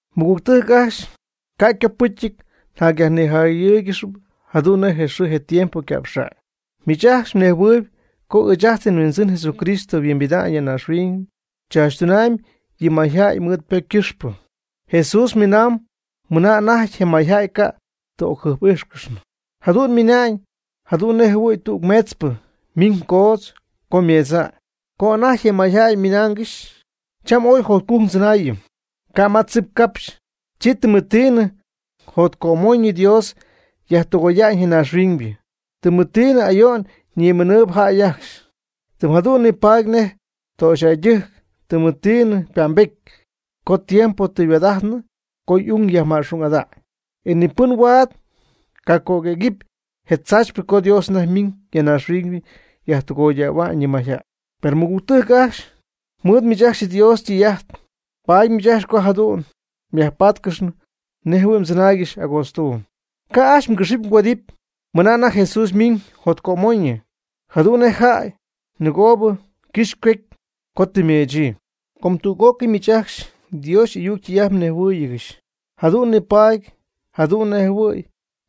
Mɨgügtɨjc ajcxy, ca' ycopɨcyɨty njacnijayɨ́ɨygɨxɨpy jadu'n nej je xɨɨ je tiempo yca'pxa'ñ. Miich ajcxy mnejhuɨɨyb co ɨɨch ajt nHuindzɨn Jesucristo yhuimbida'ñ ya naaxhuiñ tzaachytuna'ñ yɨ mayjäy mɨɨd ypocy ycɨxpɨ. Jesús miinaamb mɨna anajty je mayjäy ca' ti ocjɨjp'ijxnɨ. Jadu'n ymiina'ñ jadu'n nejjɨhuɨ̈y tüg meetzpɨ ymiñ coodz co ymeedza'ñ. Co anajty je mayjäy ymɨnaangɨxy: “Cham ooy jotcujc ndzɨnaayɨm, ca' ma tzip capxy”, chi tɨmɨtiina jotcömoñɨ Dios yajtɨgoya'ñ je naaxhuiñybɨ. Tɨmɨtiina ayo'n ñimiinɨɨyb jäy ajcxy. Tɨm jadu'n nipaady nej töxyjäydɨjc tɨmɨtiina ypa'mbety co tiempo tɨ yhuaad'ajtnɨ co y'ung yajma'xung'ada'ñ. E ni pɨn huaad cacöguëgɨpy je tzaachypɨ co Dios anajty ymiiñ ya naaxhuiñ yajtɨgoydähua'ñ yɨ mayjäy. Per mɨgügtɨjc ajcxy mɨɨd miich ajcxy Dios ytɨy'ajt, paady miich ca' jadu'n myajpáatcɨxnɨ nejjɨhuɨ̈y mdzɨnaaygɨxy agootztuuby. Ca' ajcxy mgɨxɨ́py mgüedɨ́py mɨna anajty Jesús miiñ jotcömoñɨ, jadu'n nej jäy nɨgoobɨ ycɨxy ycuecy co tɨ ymeechyii. Com tüg'ócɨy miich ajcxy Dios y'ayuc ytɨy'ajt mhuinjɨhuɨɨygɨxy, jadu'n nipaady jadu'n nejhuɨ̈y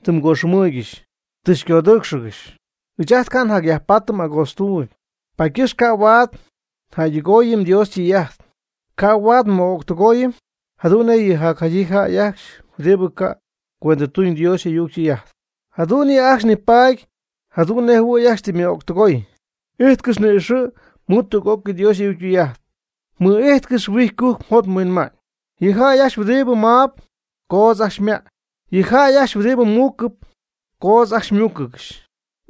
tɨ mgoxɨmɨɨygɨxy tɨ mgodɨɨcxɨ̈ccɨxy. Ɨɨch ajt ca' njacyajpaatɨm agootztuuby. Paady ycɨxpɨ ca' huaad njäydɨgooyɨm Dios ytɨy'ajt, ca' huaad nmɨ'öctɨgooyɨm jadu'n nej yɨ jacjaydyii jäy ajcxy huɨdibɨ ca' cuendɨtuñ Dios y'ayuc ytɨy'ajt, jadu'n yɨ' ajcxy nipaady jadu'n nejjɨhuɨ̈y ajcxy tɨ ymɨ'öctɨgoy. Ijtcɨx ni'ixɨ̈ mɨɨd tüg'ócɨy Dios y'ayuc ytɨy'ajt. Mɨ'ijtcɨx huijy cujc mjot mhuinma'ñ. Yɨ jäy ajcxy huɨdibɨ maab, coodz ajcxy ymäy. Yɨ jäy ajcxy huɨdibɨ muucɨp, coodz ajcxy ymúucɨgɨxy.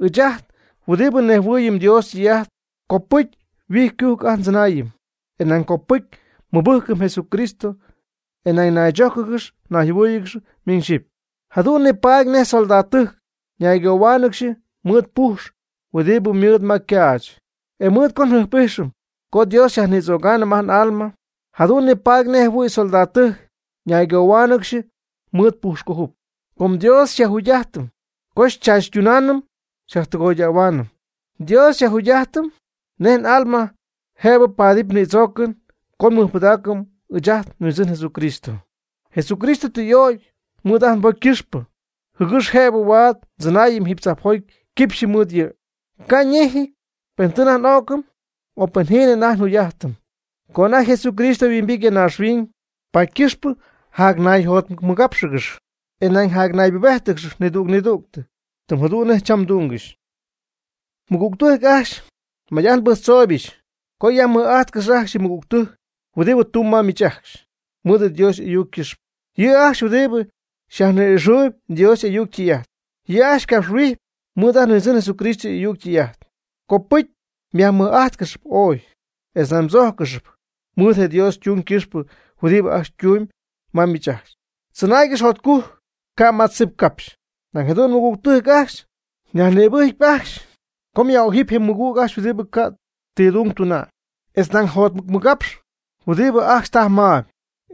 Ɨɨch ajt huɨdibɨ nnejhuɨɨyɨm Dios ytɨy'ajt, copɨcy huijy ycujc ajt ndzɨnaayɨm, e nañ copɨcy nmɨbɨjcɨm Jesucristo e nañ naychójcɨgɨx nayjɨhuɨ́ɨyɨgɨx miñ xyɨpy, jadu'n nipaady nej soldadtɨjc ñaygohuáanɨgɨxy mɨɨd pujx huɨdibɨ ymɨɨd ma ycaach. E mɨɨd co njɨjp'ijxɨm co Dios xyajnïdzögaanɨm ajt n'alma, jadu'n nipaady nejjɨhuɨ̈y soldadtɨjc ñaygohuáanɨgɨxy mɨɨd ypujxcöjup. Com Dios xyajjugy'ajtɨm co xychaachytunaanɨm xyajtɨgoyaanɨm, Dios xyajjugy'ajtɨm nej n'alma jëbɨ paatɨm nïdzoocɨn co nmɨjpɨdaacɨm ɨɨch ajt nHuindzɨn Jesucristo. Jesucristo tɨ y'ögy mɨɨd ajt nbocy ycɨxpɨ, jɨgɨx jëbɨ huaad ndzɨnaayɨm jiiby tzajpjoty quipxyɨ mɨɨd yɨ', ca' ñejɨty pen tɨ anajty n'o'cɨm o pen jiinɨ anajty njugy'ajtɨm co anajty Jesucristo yhuimbity ya naaxhuiñ. Paady ycɨxpɨ jacnayjotmɨcmɨgápxɨgɨx, e nañ jacnaybubéjtɨgɨx nidüg nidügtɨ, tɨm jadu'n nej cham mdungɨxy. Mɨgügtɨjc ajcxy, may'ajt nbɨjctzooybɨch co yajmɨj'ajtcɨxy ajcxy yɨ mɨgügtɨjc huɨdibɨ tumb ma miich ajcxy mɨɨd Dios y'ayuc ycɨxpɨ. Yɨ' ajcxy huɨdibɨ xyajni'ixɨɨyb Dios y'ayuc ytɨy'ajt, yɨ' ajcxy xycapxhuijɨp mɨɨd ajt nHuindzɨn Jesucristo y'ayuc ytɨy'ajt. Copɨcy myajmɨj'ájtcɨxɨpy ooy, etz nañ mdzójcɨxɨpy mɨɨd je Dios ytung ycɨxpɨ huɨdibɨ ajcxy ytumyb ma miich ajcxy. Tzɨnaaygɨx jotcujc ca' ma tzip capxy. Nañ jadu'n, mɨgügtɨjc ajcxy, nyajnïbɨjcpy ajcxy co myaj'ojɨp yɨ mɨgüg ajcxy huɨdibɨ ca' ti dung tuna'ñ, etz nañ mjotmɨcmɨgapxɨp huɨdibɨ ajcxy tajp maayb,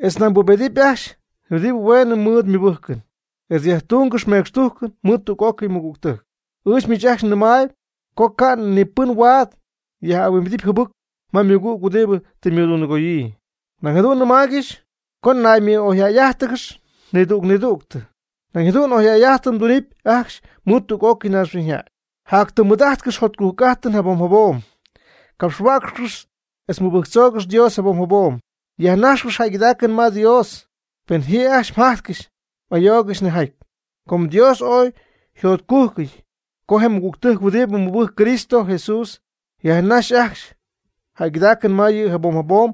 etz nañ mbubedɨpy ajcxy huɨdibɨ hueenɨ mɨɨd ymɨbɨjcɨn, etz yajtungɨx mecxtujcɨn mɨɨd tüg'ócɨy mɨgügtɨjc. Ɨɨch miich ajcxy nɨmaayb co ca' ni pɨn huaad yaj'ahuimbidɨp jɨbɨc ma ymɨgüg huɨdibɨ tɨ ymɨdundɨgoyii. Nañ jadu'n nɨmaaygɨxy co naymɨ'oyjäy'ájtɨgɨx nidüg nidügtɨ. Nañ jadu'n oyjäy'ajtɨn mdunɨpy ajcxy mɨɨd tüg'ócɨy naaxhuiñyjäy. Jatytɨm mɨɨd'ajtcɨx jotcujc'ajtɨn jabom jabom. Capxtaaccɨx etz mɨbɨjctzoogɨx Dios jabom jabom. Yajnajxcɨx jäygɨdaacɨn ma Dios pen ji ajcxy mjajtcɨxy ayoogɨxy nejjaty, com Dios ooy yjotcujcɨty co je mɨgügtɨjc huɨdibɨ mɨbɨjcp Cristo Jesús yajnaxy ajcxy jäygɨdaacɨn ma yɨ' jabom jabom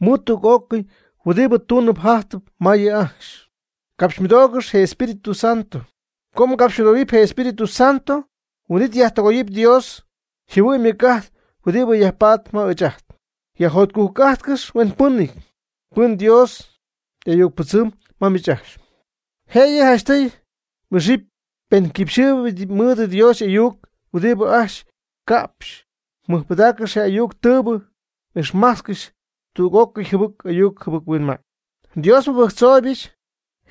mɨɨd tüg'ócɨy huɨdibɨ tuunɨp jajtɨp ma yɨ' ajcxy. Capxymɨdoogɨx je Espíritu Santo, co ngacapxymɨdoohuɨm je Espíritu Santo huin'it nyajtɨgooyɨm Dios yjɨhuɨ'ñ ymɨc'ajt huɨdibɨ yajpatp ma ɨɨch ajt. Yajjotcujc'ajtcɨx huenpɨnɨty pɨn Dios y'ayucpɨdzɨmb ma miich ajcxy. Jëyɨ janchtɨy m'ixɨpy penɨ quipxyɨɨyb mɨɨd Dios y'ayuc huɨdibɨ ajcxy ycapxyp. Mɨjpɨdaaccɨx je ayuc tɨɨybɨ. Ixmajtzcɨx tüg'ócɨy jɨbɨc ayuc jɨbɨc-huinma'ñ. Dios nmɨbɨjctzooybɨch,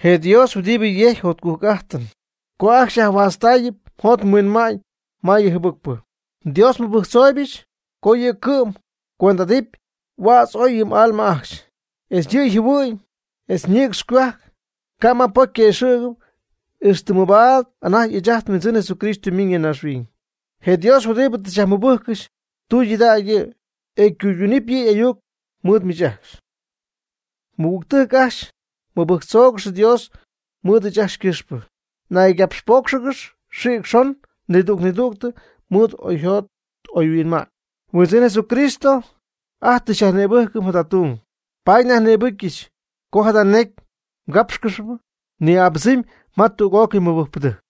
je Dios huɨdibɨ yejcpy jotcujc'ajtɨn, co ajcxy xyajhuaatztaayɨp mjot mhuinma'ñ ma yɨ jɨbɨcpɨ. Dios nmɨbɨjctzooybɨch co yɨ' cɨ'm xycuendɨ'ajtɨp huädz oy yɨ m'alma ajcxy, etz yɨ mjɨhuɨ'ñ, etz mnïcx mgohuajc, ca' ma pocy yquëxɨ̈gy, ixtɨ mabaad anajty ɨɨch ajt nHuindzɨn Jesucristo ymiiñ ya naaxhuiñ. Je Dios huɨdibɨ tɨ xyajmɨbɨjccɨxy, tudägy yɨ', e ycuydunɨpy yɨ' y'ayuc mɨɨd miich ajcxy. Mɨgügtɨjc ajcxy, mɨbɨjctzoogɨx Dios mɨɨd ɨɨch ajcxy ycɨxpɨ. Naygapxpóocxɨgɨx xïc xon nidüg nidüg mɨɨd oyjot oyhuinma'ñ. Nhuindzɨn Jesucristo ajt tɨ xyajnïbɨcyɨch jada tung, paady nyajnïbɨjccɨxy co jada necy mgápxcɨxɨpy ni'abɨdzɨmy ma tüg'ócɨy mɨbɨjcpɨdɨjc.